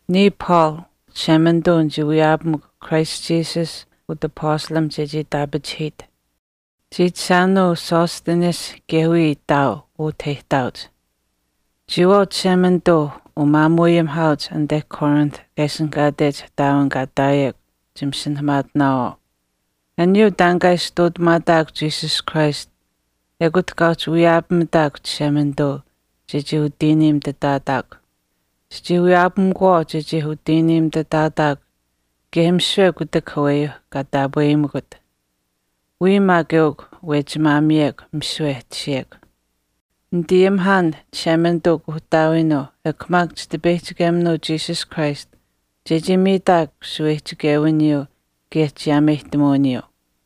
Niya Paul, Chishemanituu nichii wiyaapamukw Christ Jesus utapastalimh chechii itaapachihiit. Chiichishaanuu Sosthenes kaye wiya ihtaau utah e ihtaauch. Chiyawaau umaamuuayimihaauch anite Corinth kaa ishinihkaatech ihtaawin kaa ihtaayekw chimasinahamaatinaawaau. Aniyuu taan kaa ishi ihtuutamaataakw Jesus Christ ekut kaa uhchi wiyaapamitaakw Chishemanituu chechii utiiniimitutaataakw. Chichii wiyaapamikuwaau chechii utiiniimitutaataakw kaye misiwe aniyuuh kutak aweyuu kaa taapweyimikut chii wiyaapameu. Wiya maak eukw wechimaamiyekw misiwe e tashiyekw. Nitayimihaan Chishemanituu Kuuhtaawiinuu ekw maak chitipeyihchikeminuu Jesus Christ chechii miitaakw shaweyihchichewiniyuu kaye chiyaameyihtamuwiniyuu.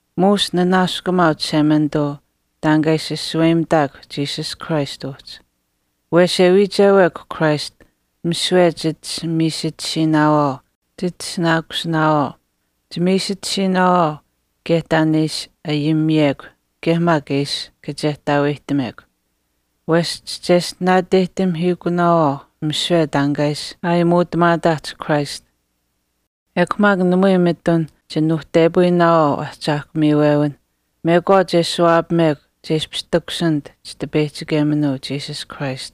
Muush nanaaskumaau Chishemanituu taan kaa ishi shaweyimitaakw Jesus Christ uhchi. Wesh e wiichewekw Christ misiwe chit ishi miisitisiinaawaau chitishinaakusinaawaau, chimiisitisiiwinaawaau kaye taan e ishi ayimiyekw kaye maak e ishi kachehtaaweyihtamekw. Wesh chicheshtinaateyihtamihiikunaawaau misiwe taan kaa ishi aayimuutamaataahch Christ. Ekw maak namui mitun chinuuhtepayinaawaau ahchaahkw miiwewinh mekwaach e ashuwaapamekw che ishpish takushinit Chitipeyichikeminuu Jesus Christ.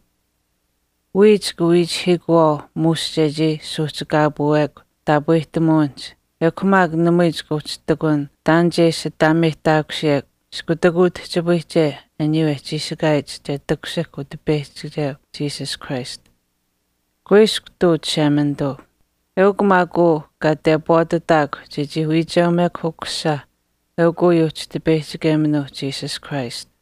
Wiya chika wiichihiikuwaau muush chechii suuhchikaapuwekw taapwehtamuwinihch ekw maak namui chika uhchi ihtakun taan che ishi ataameyihtaakusiyekw iskutak utihchipayiche aniyuu e chiishikaayich che takushihk Utipeyihchikeu Jesus Christ. Kuiskw ihtuu Chishemanituu. Eukw maak uu kaa tepwaatitaakw chechii wiicheumekw Ukusisa eukw uyuuh Chitipeyihchikeminuuh Jesus Christ.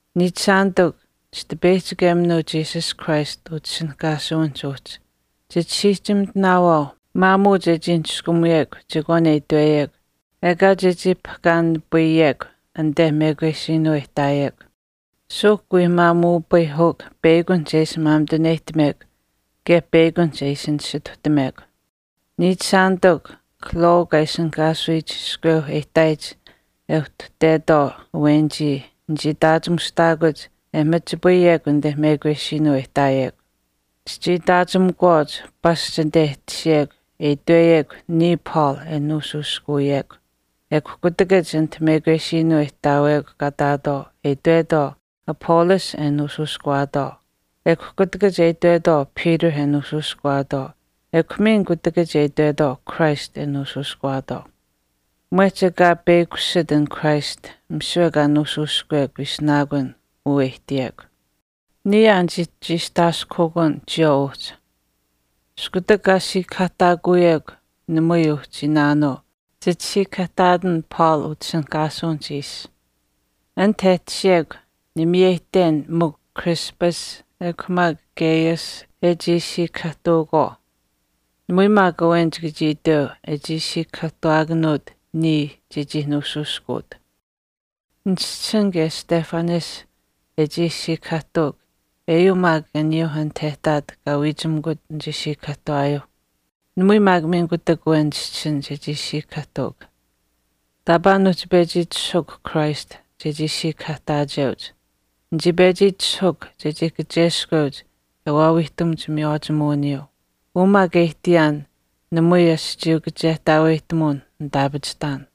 Niichishaanitikw, Chitipeyihchikeminuu Jesus Christ utishinihkaasuwinihch uhchi, chisiihchimitinaawaau maamuu chechii niskumuyekw chekwaan e itweyekw ekaa chechii papahkaanipayekw anit mekwesiinuu e ihtaayekw. Suuhk wii maamuupayihukw peyakunihch e ishi maamituneyihtamekw kaye peyakunihch e ishi nisituhtamekw. Niichishaanitikw, Chloe kaa ishinihkaasuyich iskweu e ihtaayich e uhtuhtetwaau awenichii nichii itaachimushtaakuch e mamachipayekw anit mekwesiinuu e ihtaayekw. Chichii itaachimikuwaauch pasch anit e tashiyekw kaa ihtaatwaau e itweyekw “Niya Paul e nuushuushkuwiyekw” ekw kutakach anit mekwesiinuu e ihtaawekw kaa ihtaatwaau e itwetwaau Apollos e nuushuushkuwaatwaau, ekw kutakach e itwetwaau Peter e nuushuushkuwaatwaau ekw miin kutakach e itwetwaau Christ e nuushuushkuwaatwaau. Mwehch ekaa peyakushit an christ misiwe kaa nuushuushkuwekw ishinaakun uu e ihtiyekw. Niya aa nichii chiistaaskuhukuun chiyawaau uhchi. Iskutak kaa siikahaahtaakuyekw namui uhchi iinaanuu, chit siikahaahtaatan Paul utishinihkaasuwinihch ishi. Anit e tashiyekw nimiyeyihten mikw Crispus ekw maak Gaius e chii siikahaahtuukwaau. Namui maak awen chika chii iteu e chii siikahahtuwaakanuut niya chechii pechi nuushuushkuut. Nichischisin kaye Stephanas e chii siikahaahtuuk eyuu maak aniyuuh anit e ihtaat kaa wiichimikut nichii siikahaahtuwaayuuh. Namui maak miin kutak awen nichischisin chechii siikahaahtuuk. Taapaa nuuhchi pechi itishahuukw Christ chechii siikahaahtaacheuch. Nichii pechi itishahuukw chechii kacheskweuch e waawiihtamuch miywaachimuwiniyuu. Uu maak e ihtiyaan namui aschiiyuu kachehtaaweyihtamuwin nitaapachihtaan.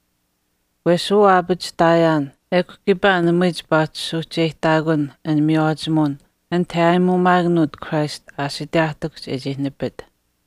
Wesh uu aapachihtaayaan ekw kiipaa namui chipaa uhchi suuhcheyihtaakun an miywaachimuwin anit yaayimuumaakanuut Christ aashiteyaahtikuhch e chii nipit.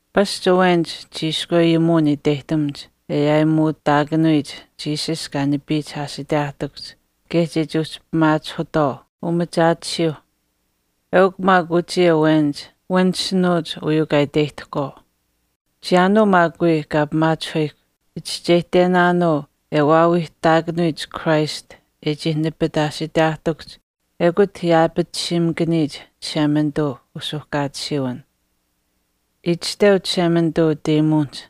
Pasch awenich chiishkwe ayimuwin iteyihtamuch e aayimuutaakanuyich Jesus kaa nipiyich aashiteyaahtikuhch chechii uhchi pimaachihuyitwaau umachaatisiyuuh. Eukw maak uchii awenich wanishinuuch uyuu kaa iteyihtahkwaau. Chiyaanuu maak wii kaa pimaachihuyikw, chichischeyihtenaanuu e waawiihtaakanuyich Christ e chii nipit aashiteyaahtikuhch ekut yaapatisiimakaniyich Chishemanituu usuuhkaatisiiwin. Itashteu Chishemanituu utayimuwinihch,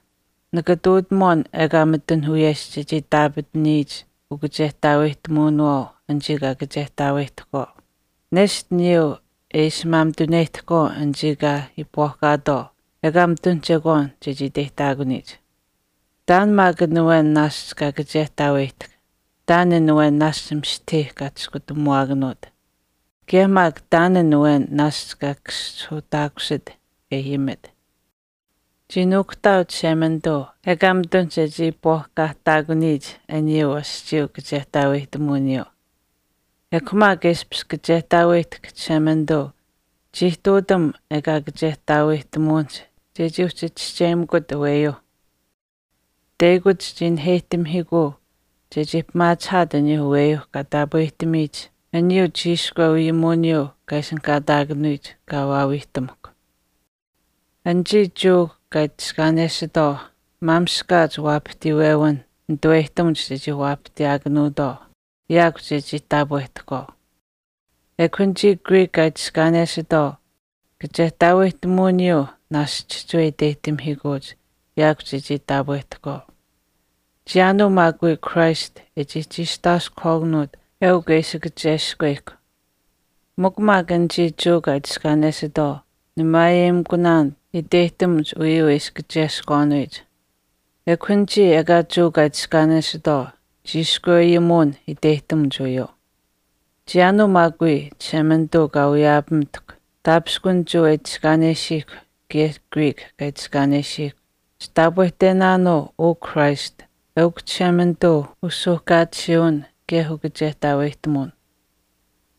Nika ihtuutamuwaan ekaa mitun wiyesh chechii itaapataniyich ukachehtaaweyihtamuwinawaau anichii kaa kachehtaaweyihtahkwaau, nesht aniyuu e ishi maamituneyihtahkwaau anichii kaa iipwaahkaatwaau ekaa mitun chekwaan chechii iteyihtaakuniyich. Taan maak an awen naashch kaa kachehtaaweyihtahk. Taan an awen naashch mistahii kaa chiskutamuwaakanuut. Kaye maak taan an awen naashch kaa kaschihuuhtaakusit e ayimit. Chii nuukuhtaau Chishemanituu ekaa mitun chechii iipwaahkaahtaakuniyich aniyuu aschiiyuu kachehtaaweyihtamuwiniyuu. Ekw maak e ishpish kachehtaaweyihtahk Chishemanituu chii ihtuutam ekaa kachehtaaweyihtamuwinihch chechii uhchi chischeyimikut aweyuuh. Teyakuch chii naheyihtamihiikuu chechii pimaachihaat aniyuu aweyuuh kaa taapwehtamiyich aniyuu chiishkwe ayimuwiniyuu kaa ishinihkaataakanuyich aniyuu wiyaawiihtamuhkw. Anichii Jewa kaa itiskaanesitwaau maamishkaach waapahtiiwewinh nituweyihtamuch chechii waapahtiyaakanuutwaau yaakw chechii taapwehtahkwaau. Ekw anichii Greek kaa itiskaanesitwaau kachehtaaweyihtamuwiniyuu naashch chihchiwe iteyihtamihiikuuch chechii uhchi taapwehtahkwaau. Chiyaanuu maak wii Christ e chii chiistaaskuhwaakanuut eukw e ishi waawiihtamuhkw e kacheskweyihkw. Mikw maak anichii Jewa kaa itiskaanesitwaau nimaayeyimikunaan iteyihtamuch uyuu e ishi kacheskwaanuyich. Ekw anichii ekaa Jewa kaa itiskaanesitwaau chiishkwe ayimuwin iteyihtamuch uyuu. Chiyaanuu maak wii Chishemanituu kaa wiyaapamitahkw, taapishkun Jewa e itiskaanesiihkw kaye Greek kaa itiskaanesiihkw, chitaapwehtenaanuu uu Christ eukw Chishemanituu usuuhkaatisiiwin kaye ukachehtaaweyihtamuwin.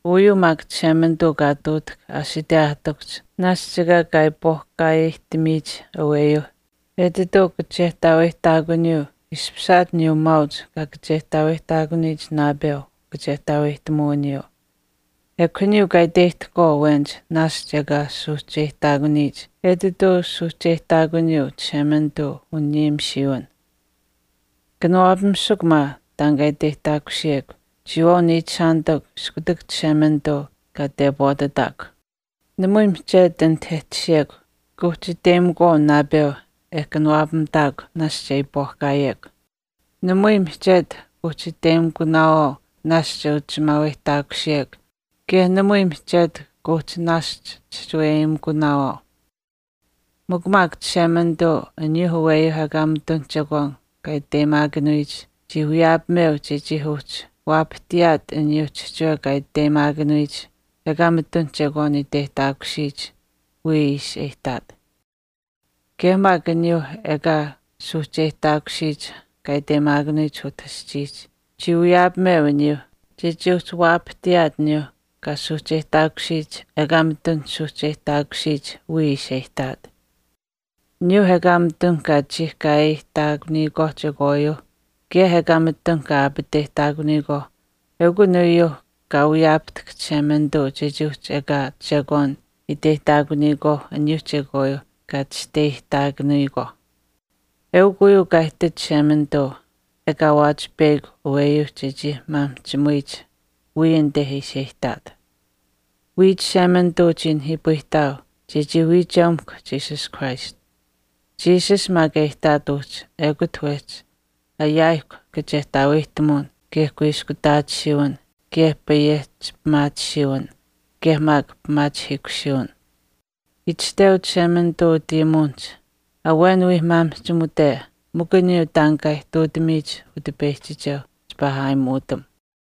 Uyuu maak Chishemanituu kaa ihtuutahk aashiteyaahtikuhch naashch ekaa kaa iipwaahkaaweyihtamiyich aweyuuh etituu kachehtaaweyihtaakuniyuu ishpishaat aniyuu maauch kaa kachehtaaweyihtaakuniyich naapeu ukachehtaaweyihtamuwiniyuu. Ekw aniyuu kaa iteyihtahkwaau awenich naashch ekaa suuhcheyihtaakuniyich etituu suuhcheyihtaakuniyuu Chishemanituu uniyimisiiwin. Kanawaapamisukw maa taan kaa iteyihtaakusiyekw chiyawaau niichishaanitikw iskutak Chishemanituu kaa tepwaatitaakw. Namui mihchetu anit e tashiyekw kuuhchi iteyimikuwaau naapeu e kanawaapamitaakw naashch e iipwaahkaawekw. Namui mihchetu kuuhchi iteyimikunaawaau naashch e uchimaaweyihtaakusiyekw kaye namui mihchetu kuuhchi naashch chihchiweyeyimikunaawaau. Mikw maak Chishemanituu aniyuuh aweyuuh ekaa mitun chekwaan kaa iteyimaakanuyich chii wiyaapameu chechii uhchi waapahtiyaat aniyuuh chihchiwe kaa iteyimaakanuyich ekaa mitun chekwaan iteyihtaakusiyich wiya ishi e ihtaat. Kaye maak aniyuuh ekaa suuhcheyihtaakusiyich kaa iteyimaakanuyich utah aschiihch chii wiyaapameu aniyuu chechii uhchi waapahtiyaat aniyuuh kaa suuhcheyihtaakusiyich ekaa mitun suuhcheyihtaakusiyich wiya ishi e ihtaat. Aniyuuh ekaa mitun kaa chiihkaayeyihtaakuniyikwaauh chekwaayuu kaye ekaa mitun kaa aapateyihtaakanuyikwaauh eukun uyuuh kaa wiyaapahtahk Chishemanituu chechii uhchi ekaa chekwaan iteyihtaakuniyikwaauh aniyuuh chekwaayuuh kaa chisteyihtaakuniyikwaauh. Eukw uyuu kaa ihtit Chishemanituu ekaa waawaach peyakw aweyuu chechii maamihchimuyich wiya anite ishi e ihtaat. Wiya Chishemanituu chii nihiipayihtaau chechii wiicheumekw Jesus Christ. Jesus maak e ihtaat uhchi ekute wehchi ayaayihkw kachehtaaweyihtamuwin, kaye kuiskutaatisiiwin, kaye payehchi pimaatisiiwin, kaye maak pimaachihiikusiiwin. Itashteu Chishemanituu utayimuwinihch, “Awen wii maamihchimute mikw aniyuu taan kaa ihtuutamiyich Utipeyihchikeuh chipaa aayimuutam.”